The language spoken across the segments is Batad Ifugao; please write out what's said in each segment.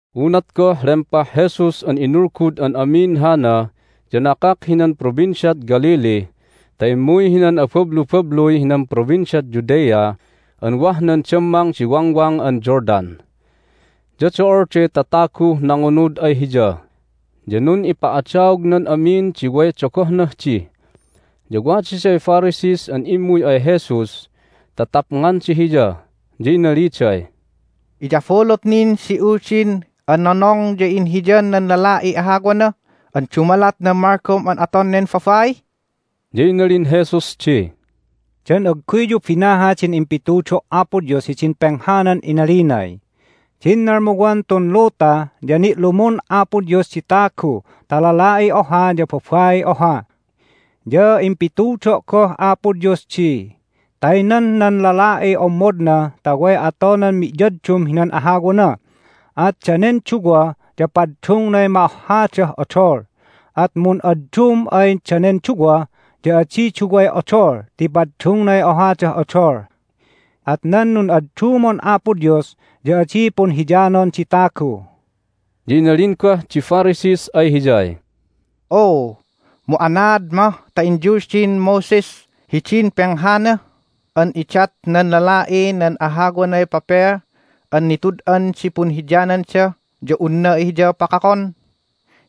Unat goh lempah Jesus an inulgud an amin hana ya nakak hinan Provinciad Galilee ta immuy hinan abablubabluy hinan Provinciad Judea an wah nan dammang di Wangwang an Jordan. Ya do'olday tataguh nangunud ay Hiya, ya nun'ipa'adaognan amin di way dogohnah di. Ya wadaday Pharisees an immuy ay Jesus ta tapnganda Hiya, ya inaliday, "Iyabulut nin di Uldin an nonong ya inhiyan nan lala'iy ahawana an dumalat nan malgom an aton nen babai?" Ya inalin Jesus di, "Dan agguyyu binaha din impitudo' Apo Dios hidin penghanan inalinay, Din nalmuwan tun luta ya ni'lumun Apo Dios di tagu ta lala'i oha ya babai oha? Ya impitudo' goh Apo Dios di, Taynan nan lala'i ommodna ta way atonan mi'yaddum hinan ahawana, at danen duwa ya paddungnay ma'ohhadah odol. At mun'addum ay danen duwa ya adi duway odol ti paddungnay ohadah odol. At nan nun'addumon Apo Dios ya adi punhiyanon di tagu." Ya inalin goh di Pharisees ay Hiyay, "Oo, mu anaad mah ta inyuldin Moses hidin penghana an idat nan lala'ih nan ahawanay pepel an nitud'an di punhiyananda ya unna hiya pakakon?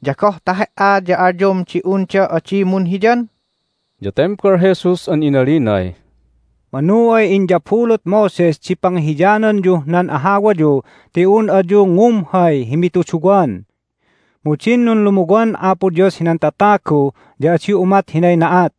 Ya goh ta He"a ya alyom di unda adi munhiyan?" Ya tembal Jesus an inalinay, "Manu ay inyabulut Moses di pangihiyananyuh nan ahawayu ti un ayu ngumhay hi mituduwan. Mu din nunlumuwan Apo Dios hinan tatagu ya adi umat hinay na'at.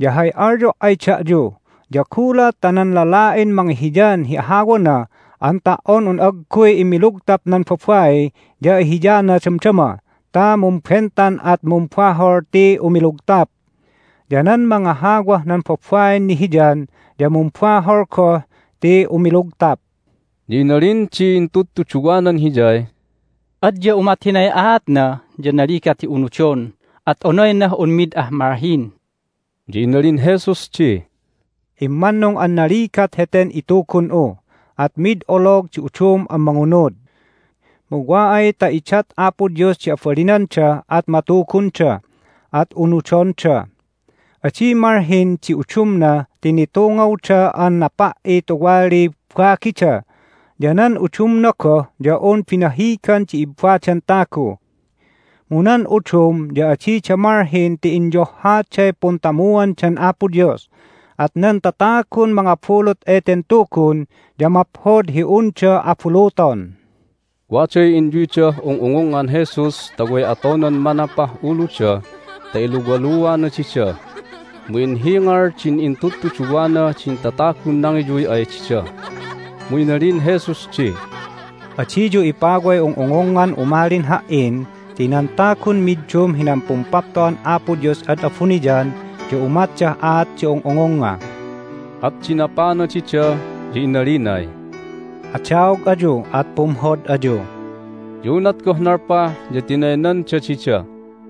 Ya hay alyo' ay da'yu ya gulat ta nan lala'in mangihiyan hi ahawana an ta"on un agguy immilugtap nan babai ya ihiyana damdama ta mumbentan at mumbahol ti umilugtap. Ya nan mangahawah nan babain nihiyan ya mumbahol goh ti umilugtap." Ya inalin di intudtuduwanan Hiyay, "Adya umat hinay aatna ya naligat hi unudon, at onaynah un mid ah malhin!" Ya inalin Jesus di, "Immannung an naligat heten itugun'u, at mid olog di udum an mangunud. Mu wa ay ta idat Apo Dios di abalinanda at matugunda, at unudonda. Adi malhin di udumna ti nitungawda an napa"i tuwaliy bagida, ya nan udumna goh ya un binahigan di ibbadan tagu. Mu nan udum ya adida malhin ti inyohhaday puntamuandan Apo Dios, at nan tatagun mangabulut eten tugun ya maphod hi unda abuluton." Waday inyuydah ung'ungungngan Jesus ta way atonan manapah uluda ta iluwaluana dida. Mu inhingal din intudtuduwana din tatagun nangiyuy ay dida. Mu inalin Jesus di, "Adiyu ipaway ung'ungungngan umalin Ha"in ti nan tagun middum hinan Pumpapto'an Apo Dios ad abuniyan ya umatdah aat di ung'ungungnga." At dinapana dida, ya inalinay, "Adaog ayu, at pumhod ayu!" Ya unat goh nalpah ya tinaynanda dida.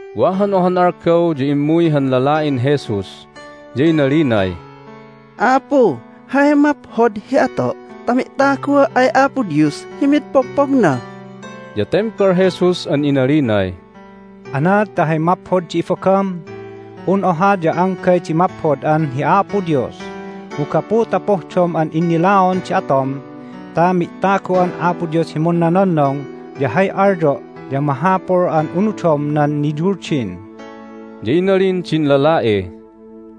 Wa han ohan algaw ya immuy han lala'in Jesus, ya inalinay, "Apu, hay maphod hi ato' ta mi'tagua' ay Apo Dios hi mid pogpogna?" Ya tembal Jesus an inalinay, "Anaad ta hay maphod di ibagam? Un oha ya anggay di maphod an hi Apo Dios! Mu gapu ta pohdom an innilaon di atom ta mi'tagu'an Apo Dios hi munnononnong ya hay alyo' ya mahapul an unudom nan niyuldin." Ya inalin din lala'i,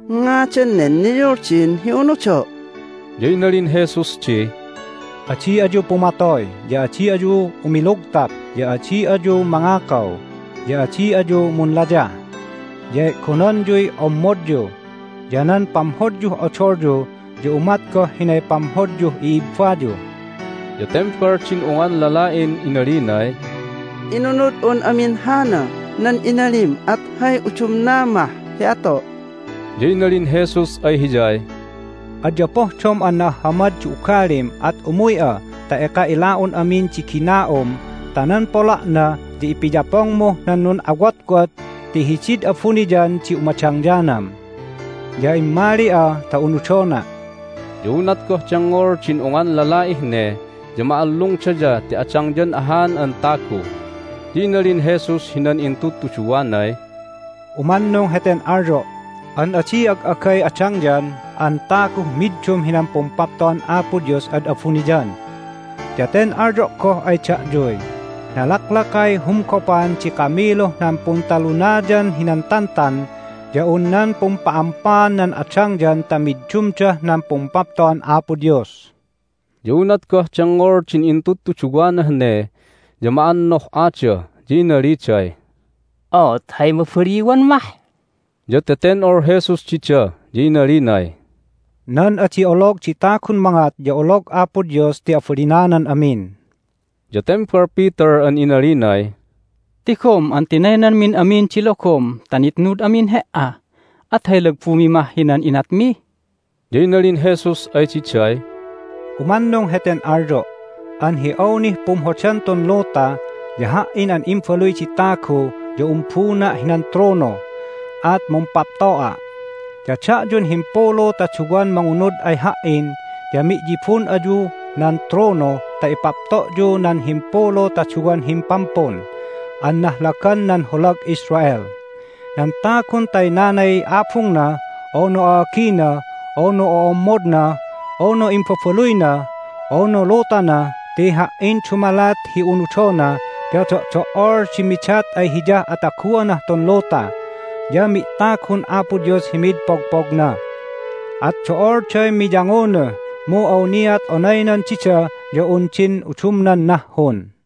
"Ngadan nen niyuldin hi unudo'?" Ya inalin Jesus di, "Adi ayu pumatoy, ya adi ayu umilugtap, ya adi ayu mangakaw, ya adi ayu munlayah, ya e'gonanyuy ommodyu, ya nan pamhodyuh odolyu ya umat goh hinay pamhodyuh i'ibbayu." Ya tembal din ungan lala'in inalinay, "Inunud'un amin hana nan inalim, at hay udumna mah hi ato'?" Ya inalin Jesus ay hiyay, "Adya pohdom an na'ahhamad di ugalim at umuy'a ta eka ila'un amin di gina'um ta nan pola'na ya ipiyapongmuh nan nun'awotwot ti hidid abuniyan di umadangyanam. Ya immali'a ta unudona'." Ya unat goh dengngol din ungan lala'ih ne ya ma'allungdaya ti adangyan ahan an tagu. Ya inalin Jesus hinan intudtuduwanay, "Umannung heten alyo' an adi ag'agay adangyan an taguh middum hinan Pumpapto'an Apo Dios ad abuniyan! Ya ten alyo' goh ay da'yuy, Nalaklakay humgopan di kamiluh nan Puntalunayan hinan Tantan ya un nan pumpa'ampaan nan adangyan ta middumdah nan Pumpapto'an Apo Dios." Ya unat goh dengngol din intudtuduwanah ne ya ma'annoh'ada, ya inaliday, "Oot, hay mabaliwan mah?" Ya teten'ol Jesus dida, ya inalinay, "Nan adi olog di tagun mangat ya olog Apo Dios ti abalinanan amin." Ya tembal Peter an inalinay, "Tigom an tinaynanmin amin di logom ta nitnud amin He"a! At hay lagbumi mah hinan inatmi?" Ya inalin Jesus ay diday, "Umannung heten alyo' an hi awnih pumhodan tun luta ya Ha"in an Imbaluy di Tagu ya umbuna' hinan trono, at mumpapto'a'. Ya da'yun himpulu ta duwan mangunud ay Ha"in ya mi'yibun ayuh nan trono ta ipapto'yu nan himpulu ta duwan himpampun an nahlagan nan holag Israel. Nan tagun taynanay abungna, unu a'agina, unu ommodna, unu imbabaluyna, unu lutana ti Ha"in dumalat hi unudona ya do'do"ol di midat ay hiyah ataguanah tun luta, ya mi'tagun Apo Dios hi mid pogpogna. At do'olday miyangunuh, mu awniat onaynan dida ya un din udumnan nahhun."